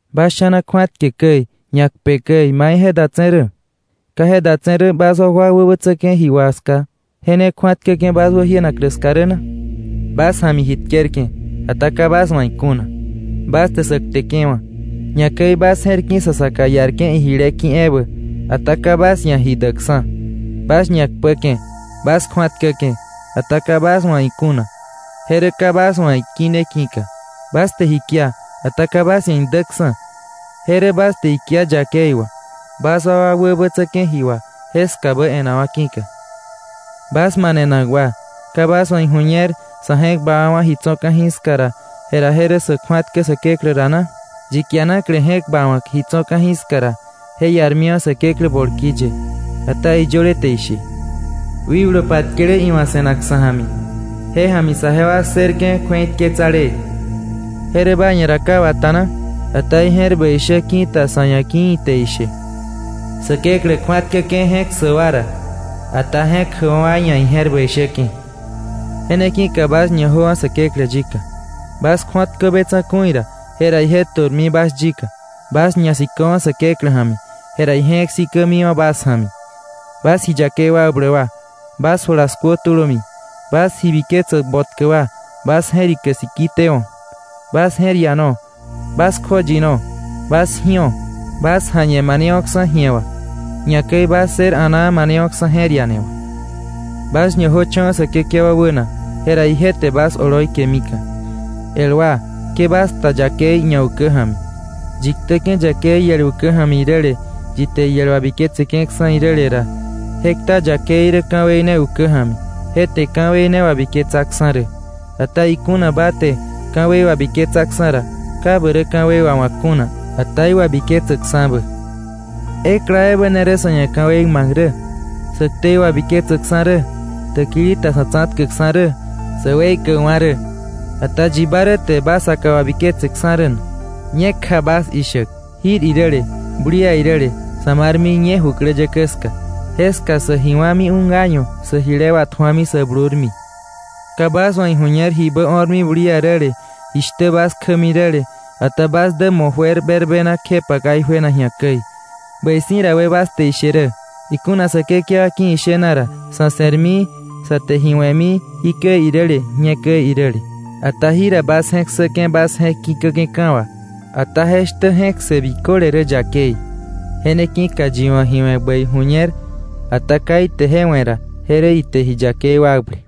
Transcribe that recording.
¿Bas sha̱na kju̱atke käi, ñakpe käi mai je datse̱ rä? ¿Ka je datse̱ rä bas wakwa wäbätsäke̱ ji wà ska, je ne kju̱atkäke̱ bas wäjienaklä ska rä na? Bas ja̱mi ji tkerke̱, ata ka bas wa̱ ikuna. Bas te sä kteke̱wa̱, ñakäi bas je̱r ki̱ sa saka iarke̱ ijile ki̱ ebä, ata ka bas ia̱ ji däkksa̱. Bas ñakpäke̱, bas kju̱atkäke̱, ata ka bas wa̱ ikuna, je rä ka bas wa̱ ikine ki̱ka. Bas te ji kia, ata ka bas ia̱ idäksa̱. Je rä bas te ikia yakei wà, bas wakwa wäbätsäke̱ ji wà jeskabä e̱nenakwa̱ ki̱ka. ¡Bas manenak wa! ¿Ka bas wa̱ iju̱ñer sa̱ je̱k bawa̱wa̱ ji tso̱ ka̱jiska ra, jera je rä sa̱ kju̱atkä Säkeklä ra na? Yi kianakle je̱k bawa̱k ji tso̱ ka̱jiska ra, je iarmiwa̱ Säkeklä bolki ye. Ata iyöle te ishe: “Wikblu patkele iwa̱ se̱nak sa̱ ja̱mi, je ja̱mi saje wa ssërke̱ kju̱eitketsalee”, ¿je rä ba ia̱ ra ka wata na? Ata ije̱r bäi shä ki̱ta sa̱ ia̱, ki̱ ite ishe: “Säkeklä kju̱atkäke̱ je̱k ssäk wa ra, ata je̱k jäkwa̱ wa ia̱ ije̱r bäi shäke̱.” Je ne ki̱ka bas ñajöwa̱ Säkeklä yika. Bas kju̱atkö be tsa̱ku̱i ra, jera ije tu̱rmi bas yika. Bas ñasiköwa̱ Säkeklä ja̱mi, jera ije je̱k sikämiwa̱ bas ja̱mi. Bas ji yakei wakbläk wa, bas jula skuö tulömi; bas ji biketsäk botkä wa, bas je̱rike siki tewo̱. Bas je̱r iano, bas kjoyino, bas ji̱o. Bas ja̱ñe manewo̱ksa̱ ji̱e wà; ñakäi bas ssër a̱naa manewo̱ksa̱ je̱r iane wà. Bas ñajöcho̱wa̱ Säkekewa wäna, jera ije te bas oloi kemika̱. El wa, ke bas kta yakei ñaukä ja̱mi. Yi ktäke̱ yakei iel ukä ja̱mi iräle, yi te iel wabiketseke̱ksa̱ iräle ra, je kta yakei rä ka̱wei ne ukä ja̱mi, je te ka̱wei ne wabiketsaksa̱ rä. Ata ikuna ba te ka̱wei wabiketsaksa̱ ra, ka ba rä ka̱wei wawa̱k kuna, ata iwabiketsäksa̱bä. Ekla ebä ne rä sa̱ ia̱ ka̱wei ma̱k rä, ñakäi sä ktei wabiketsäkksa̱ rä, täkili ta sa̱ tsa̱tkäkksa̱ rä, ñakäi sä weikäkwa̱ rä. Ata ¿yi ba rä te ba saka wabiketseksa̱ rä na? Ñekja bas ishäk: “Jir iräle bulia iräle, sä marmi ñe jukläyäkä ska, jeska sä ji wa̱mi un año; sä jile watju̱ami sä blurmi,” ka bas wa̱ iju̱ñer jibä o̱rmi bulia räle, jishtä bas kjämi räle. Ata bas dä mo̱ juer berbena kjepa ka ijuena ji̱a käi. Bäi si̱ ra, we bas te ishe rä: “Ikuna Säkekewa ki̱ ishena ra, sá se̱rmi sá te ji we̱mi jikäi iräle, ñe käi iräle.” Ata jira bas je̱k ssäke̱ bas je̱k ki̱käke̱ka̱ wà. Ata je shtä je̱k ssë biköle rä yakei. Je ne ki̱ka yi wa̱ ji we̱ bäi ju̱ñer, ata ka ite je we̱ ra, je rä ite ji yakei wakble.